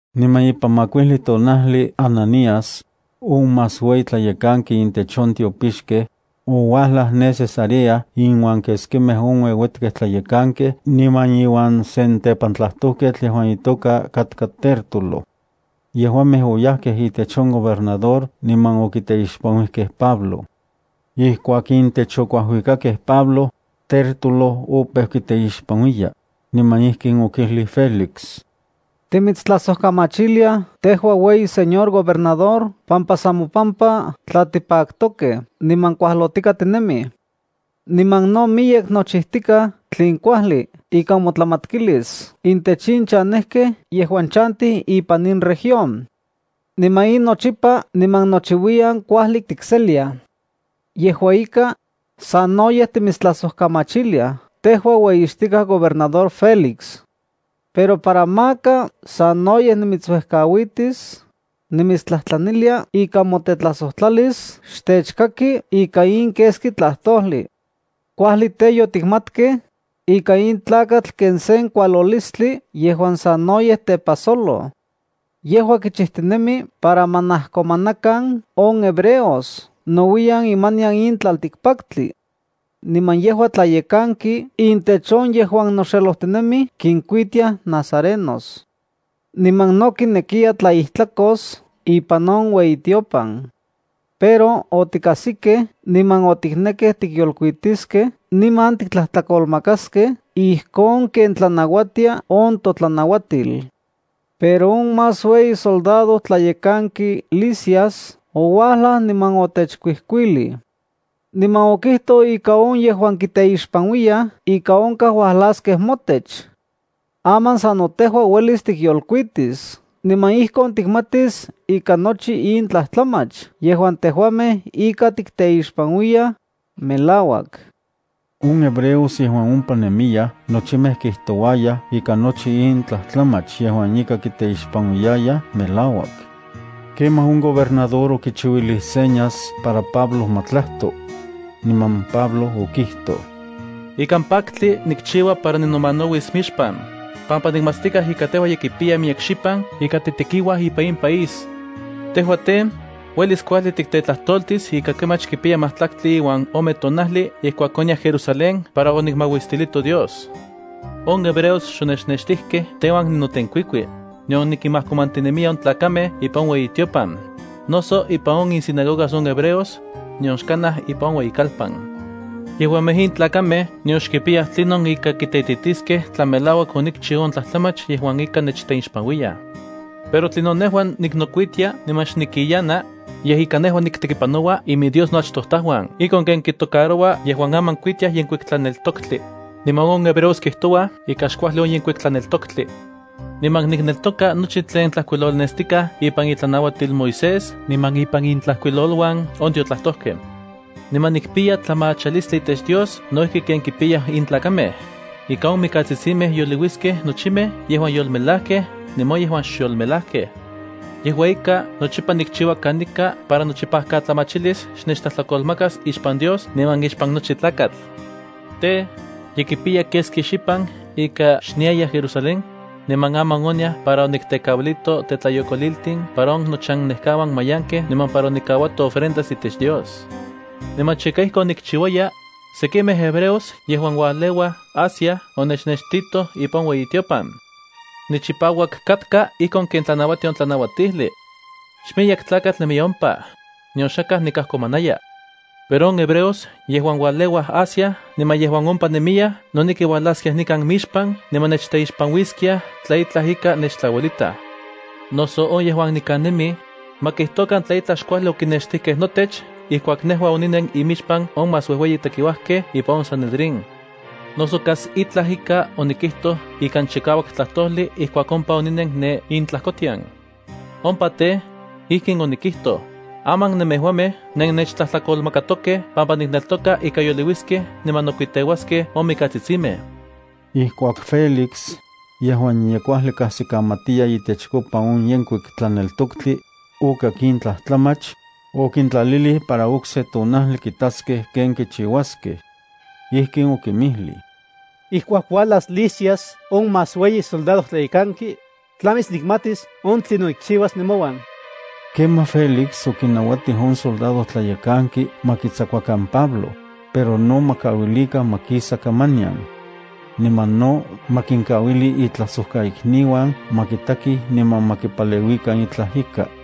Niman ipan makuijli tonajli Ananías, on más ueyi tlayekanki intech on tiopixkej, ouajlaj ne Cesarea inuan keskimej on ueuetkej tlayekankej niman iuan sen tepantlajtojketl yejuan itoka katka Tértulo. Yejuamej oyajkej itech on gobernador niman okiteixpanuijkej Pablo. Ijkuak intech okuajuikakej Pablo, Tértulo opeu kiteixpanuiya, niman ijkin okijlij Félix: —Timitstlajsojkamachiliaj tejua ueyi señor gobernador pampa san mopampa tla tipaktokej niman kuajlotika tinemij. Niman no miyek nochijtikaj tlen kuajli ika motlamatkilis intech in chanejkej yejuan chantij ipan in región. Niman in nochipa niman nochiuiyan kuajli tikseliaj. Yejua ika, sanoyej timitstlasojkamachiliaj tejua ueyixtikaj gobernador Félix. Pero para maka sanoyej nimitsuejkauitis, nimitstlajtlanilia ika motetlajsojtlalis xtechkaki ika in keski tlajtojli. Kuajli tej, yotikmatkej ika in tlakatl ken sen kualolistli yejuan sanoyej tepajsoloj. Yejua kichijtinemi para ma najkomanakan on hebreos nouiyan imanian in tlaltikpaktli. Niman yejua tlayekanki intech on yejuan noxelojtinemij kinkuitiaj nazarenos. Niman no kinekiya tlaijtlakos ipan on ueyitiopan. Pero otikajsikej niman otiknekej tikyolkuitiskej niman tiktlajtlakolmakaskej ijkon ken tlanauatia on totlanauatil. Pero on más ueyi soldadojtlayekanki Lisias ouajlaj niman otechkuijkuilij. Niman okijtoj ika on yejuan kiteixpanuiyaj ika onkaj uajlaskej motech. Aman sano tejua uelis tikyolkuitis niman ijkon tikmatis ika nochi in tlajtlamach yejuan tejuamej ika tikteixpanuiyaj melauak. On hebreos yejuan ompa nemiyaj nochimej kijtouayaj ika nochi in tlajtlamach yejuan ika kiteixpanuiyayaj melauak. Kemaj on gobernador okichiuilij señas para Pablo ma tlajto. Niman Pablo okijtoj: —Ikan paktli nikchiua para ninomanauis mixpan, pampa nikmatstikaj ika tejua ye kipiya miyek xipan ika titekiuaj ipan in país. Tejua tej, uelis kuajli tiktetlajtoltis ika kemach kipiya majtlaktli uan ome tonajli ijkuak oniaj Jerusalén para onikmauistilito Dios. On hebreos xonechnextijkej teuan ninotenkuikui, nion nikinmajkomantinemiya on tlakamej ipan on ueyitiopan, noso ipan insinagogas on hebreos, nion xkanaj ipan on ueyikalpan. Yejuamej in tlakamej nion xkipiyaj tlinon ika kiteititiskej tla melauak onikchiu on tlajtlamach yejuan ika nechteixpanuiyaj. Pero tlinon nejua niknokuitia niman xnikiyana, yej ika nejua niktekipanoua iminDios noachtojtajuan ijkon ken kitocaroua yejuan aman kuitiaj Yenkuik Tlaneltoktli, niman on hebreos kijtouaj ika xkuajli on Yenkuik Tlaneltoktli. Niman nikneltoka nochi tlen tlajkuilolnestikaj ipan itlanauatil Moisés niman ipan intlajkuiloluan on tiotlajtojkej. Niman nikpiya tlamachalistli itech Dios no ijki ken kipiyaj in tlakamej, ika on mikatsitsimej yoliuiskej nochimej yejuan yolmelajkej niman on yejuan xyolmelajkej. Yejua ika nochipa nikchiua kanika para nochipajkatlamachilis xnechtlajtlakolmakas ixpan Dios niman ixpan nochi tlakatl. ’Tej, ye kipiya keski xipan ika xniaya Jerusalén, niman aman oniaj para oniktekauilito tetlayokoliltin para on nochannekauan mayankej niman para onikauato ofrendas itech Dios. Niman chika ijkon nikchiuaya, sekimej hebreos yejuan ualeuaj Asia onechnextitoj ipan on ueyitiopan. Nichipauak katka ijkon ken tlanauatia on tlanauatijli. Xmiyek tlakatl nemiya ompa, nion xakaj nikajkomanaya. Pero on hebreos yejuan ualeuaj Asia niman yejuan ompa nemiyaj noneki uajlaskiaj nikan mixpan niman nechteixpanuiskiaj tla itlaj ika nechtlauelitaj. Noso on yejuan nikan nemij, ma kijtokan tla itlaj xkuajli okinextijkej notech ijkuak nejua oninen imixpan on más uejueyi tekiuajkej ipan on Sanedrín, noso kas tla ika onikijtoj ikan chikauak tlajtojli ijkuak ompa oninen ne intlajkotian. Ompa tej, ijkin onikijtoj: “Aman nemejuamej nennechtlajtlakolmakatokej pampa nikneltoka ika yoliuiskej niman nokuiteuaskej on mikatsitsimej.” Ijkuak Félix, yejuan ye kuajli kajsikamatiya itechkopa on Yenkuik Tlaneltoktli, okak in tlajtlamach, okintlalilij para okse tonajli kitaskej ken kichiuaskej. Ijkin okinmijlij: —Ijkuak uajlas Lisias on más ueyi soldadojtlayekanki, tlamis nikmatis on tlinon nikchiuas nemouan. Kemaj Félix okinauatij on soldadojtlayekanki ma kitsakuakan Pablo, pero no ma kauilikan ma kisa kamanian. Niman no ma kinkauili itlajsojkaikniuan ma kitakij niman ma kipaleuikan itlaj ika.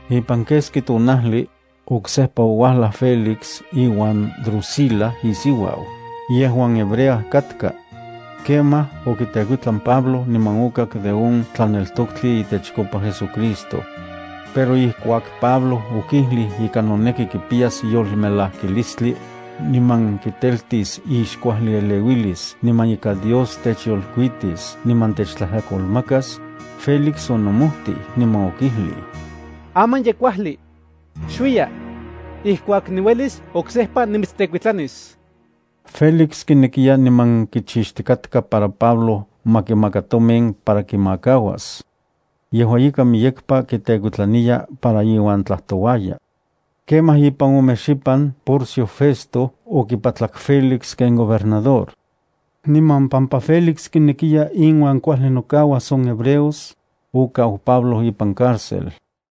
Ipan keski tonajli, oksejpa ouajlaj Félix iuan Drusila isiuau, yejuan hebrea katka. Kemaj okitekuitlan Pablo niman okak de on tlaneltoktli itechkopa JesuCristo. Pero ijkuak Pablo okijlij ika noneki kipiyas yolmelajkilistli, niman kiteltis ixkuajlieleuilis niman ika Dios techyolkuitis niman techtlajtlakolmakas, Félix onomojtij niman okijlij: —Aman ye kuajli. Xuiya. Ijkuak niuelis oksejpa nimitstekuitlanis. Félix kinekiya niman kichixtikatka para Pablo ma kimaka tomin para kimakauas. Yejua ika, miyekpa kitekuitlaniya para iuan tlajtouaya. Kemaj ipan ome xipan Porcio Festo okipatlak Félix ken gobernador. Niman pampa Félix kinekiya inuan kuajli nokauas on hebreos, okau Pablo ipan cárcel.